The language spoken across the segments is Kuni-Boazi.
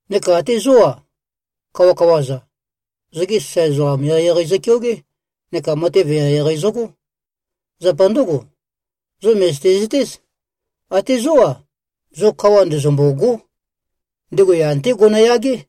Neka até zó-a, kawakawa-za, zogi sasae ezoqam eqeieqei zøkeogé neka matev eqeieqei zøgó. Zapa ndǿgo, zo mø̀zøte-zøtéz, até zó-a, zo kawa ndezømbôgó. Ndego yan-té gonoyagé.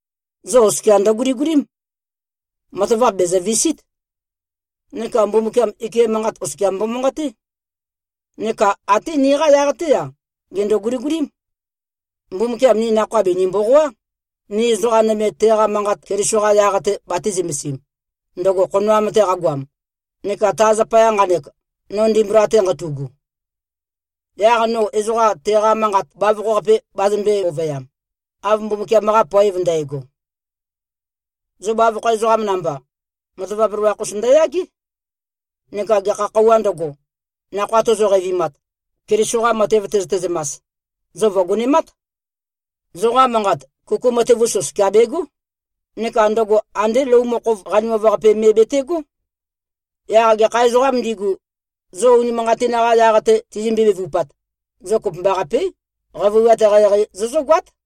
Zo oskia ndøguligulím. Matavap bèzøvisít. Neka Mbumbukiam ike manqat oskia mbomanqaté. Neka até niqa yaq-té-a, gèndo-guligulím. Mbumbukiam ni nakhoa bìni-mboqoá, ni ezoqa nøme teqa manqat Keliso-qa yaq-te batī-zømesim, ndøgo khonoam-te qagoam neka ta zapaya nqanek, no ndimbula-te nqatu꞉gu. Yaq no ezoqa teqa manqat bavokho-qape bazømbē-ovøyam, av Mbumbukiam-qa poev ndægo. Zo bavokho ezoqam namba, matavap loloakh-us ndøyagé. Neka gekha khøuwā ndøgo, nakhoa tozo-qeivimat, Keliso-qa matev tøzøte-zømas, zo vø̀gonemát. Zoqa manqat, kuku matev-us oskia begó. Neka ndøgo andé lou mokhov qanimav-qape me betegó. Yaq gekha ezoqām ndigu, zo unimanqatin-qa yaq-te tizømbe-bevupat, zo kopømbaqapé, qavøiwat eqeieqei zozǿgoát.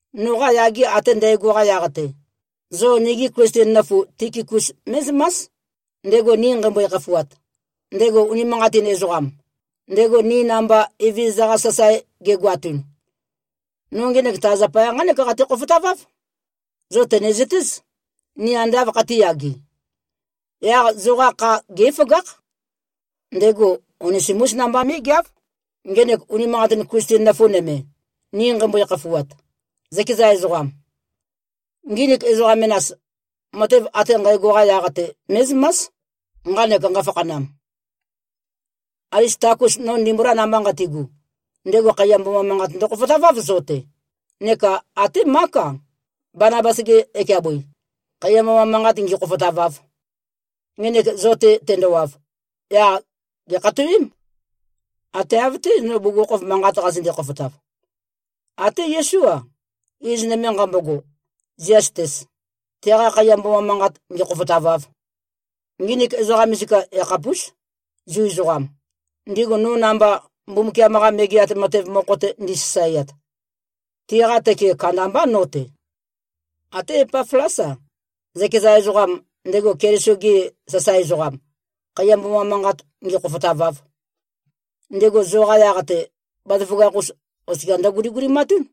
Noqa yage ate ndægo-qa yaq-te, zo nigi Klisten nøfu Tikikus mé꞉zømás, ndego ni nqeimbøe-khafuat, ndego unimanqatin ezoqam, ndego ni namba Evezøza-qa sasae gegoatun. No ngenek ta zapaya nqánek qate-khofotaváv: Zo tø̀nezøtéz, ni ande āv khatīyage. Yaq zoqa kha gé꞉føgákh. Ndego Onesimús namba mé꞉geáv, ngenek unimanqatin Klisten nøfu nøme, ni nqeimbøe-khafuat, zøkeza ezoqam. Nginik ezoqa menas, matev ate nqægo-qa yaq-te mé꞉zømás, nqanek nqafakhanam. Alistakus, no ndimbula namba nqatigu, ndego khaiya mboma manqat ndøkhofotaváv zo-te, neka até Mák-a, Banabas-ge ekeabøi, khaiya mboma manqat ngīkhōfōtāvāv. Ngenek zo-te tendowav, yaq gèkhatowém, ate av-té, no bugukhokhof manqat qazønde-khofotav. Até Yesú-a, iz nøme nqambogo, Ziastes, teqa khaiya mboma manqat ngēkhōfōtāvāv. Nginik ezoqa misika yakhapús, Zu ezoqam, ndigu no namba Mbumbukiam-qa Megeat Matev mokho-te ndisasaeat. Tiqa tøke kandambá no-te. Até Epaflás-a, zøkeza ezoqam, ndego Keliso Yesu-ge sasae ezoqam, khaiya mboma manqat ngēkhōfōtāvāv. Ndego zoqa yaq-te, bazaføgakh-us oskia ndøguligulimatún.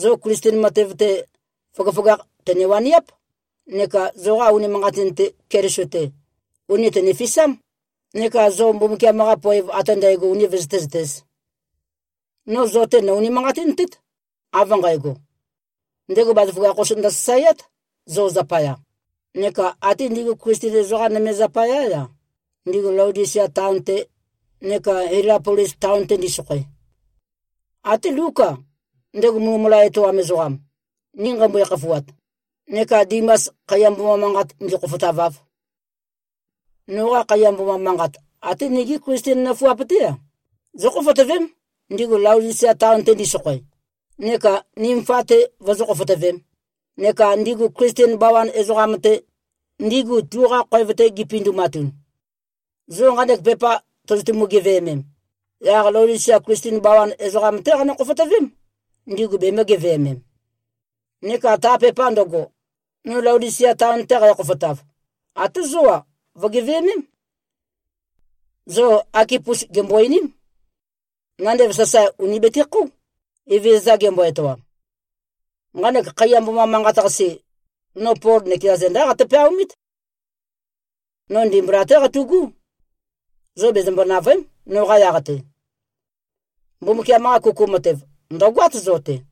Zo Klisten matev-te, føgøføgakh tø̀ne-waniáp, neka zoqa unimanqatin-te, Keliso-te, ùni tønefisám, neka zo Mbumbukiam-qa poev ate ndægo uni vøzøté-zøtēz. No zo-te nò-unimanqatintét, av nqægo: Ndego bazaføgakh-us ndøsasaeát, zo zapaya, neka até ndigu Klisten ezoqa nøme zapayá-a, ndigu Laodisia taon-te neka Hielapolis taon-te ndisokhoe. Até Lúk-a, ndego mulømula etoam ezoqam, ni nqeimbøe-khafuat, neka Dimas, khaiya mboma manqat ngīkhōfōtāvāv. Noqa khaiya mboma manqat, até nigi Klisten nøfuap-té-a, zókhofotøvém, ndigu Laodisia taon-te ndisokhoe, neka Nimfa-te vozó-khofotøvēm, neka ndigu Klisten bawan ezoqam-te, ndigu tuqa khoev-te gipindumatun. Zo nqanek pepa tozotumu-geveømem, yaq Laodisia Klisten bawan ezoqam-té qanø-khofotøvém, ndigu bemø̄-geveømem. Neka ta pepa ndøgo, no Laodisia taon-te qækhofotav, até zó-a, vø̀geveømém. Zo Akipus gèmbo-einím. Nandev sasae ùni betekhóu, Evezøza gembo-etoam. Nqanek khaiya mboma manqat-qase, no Pol nøkeza zendá qate-peaomít. No ndimbula-té qatu꞉gú. Zo bezømbo-nàvøe᷄m, noqa yaq-te. Mbumbukiam-qa kuku matev, ndø̀goát zo-te.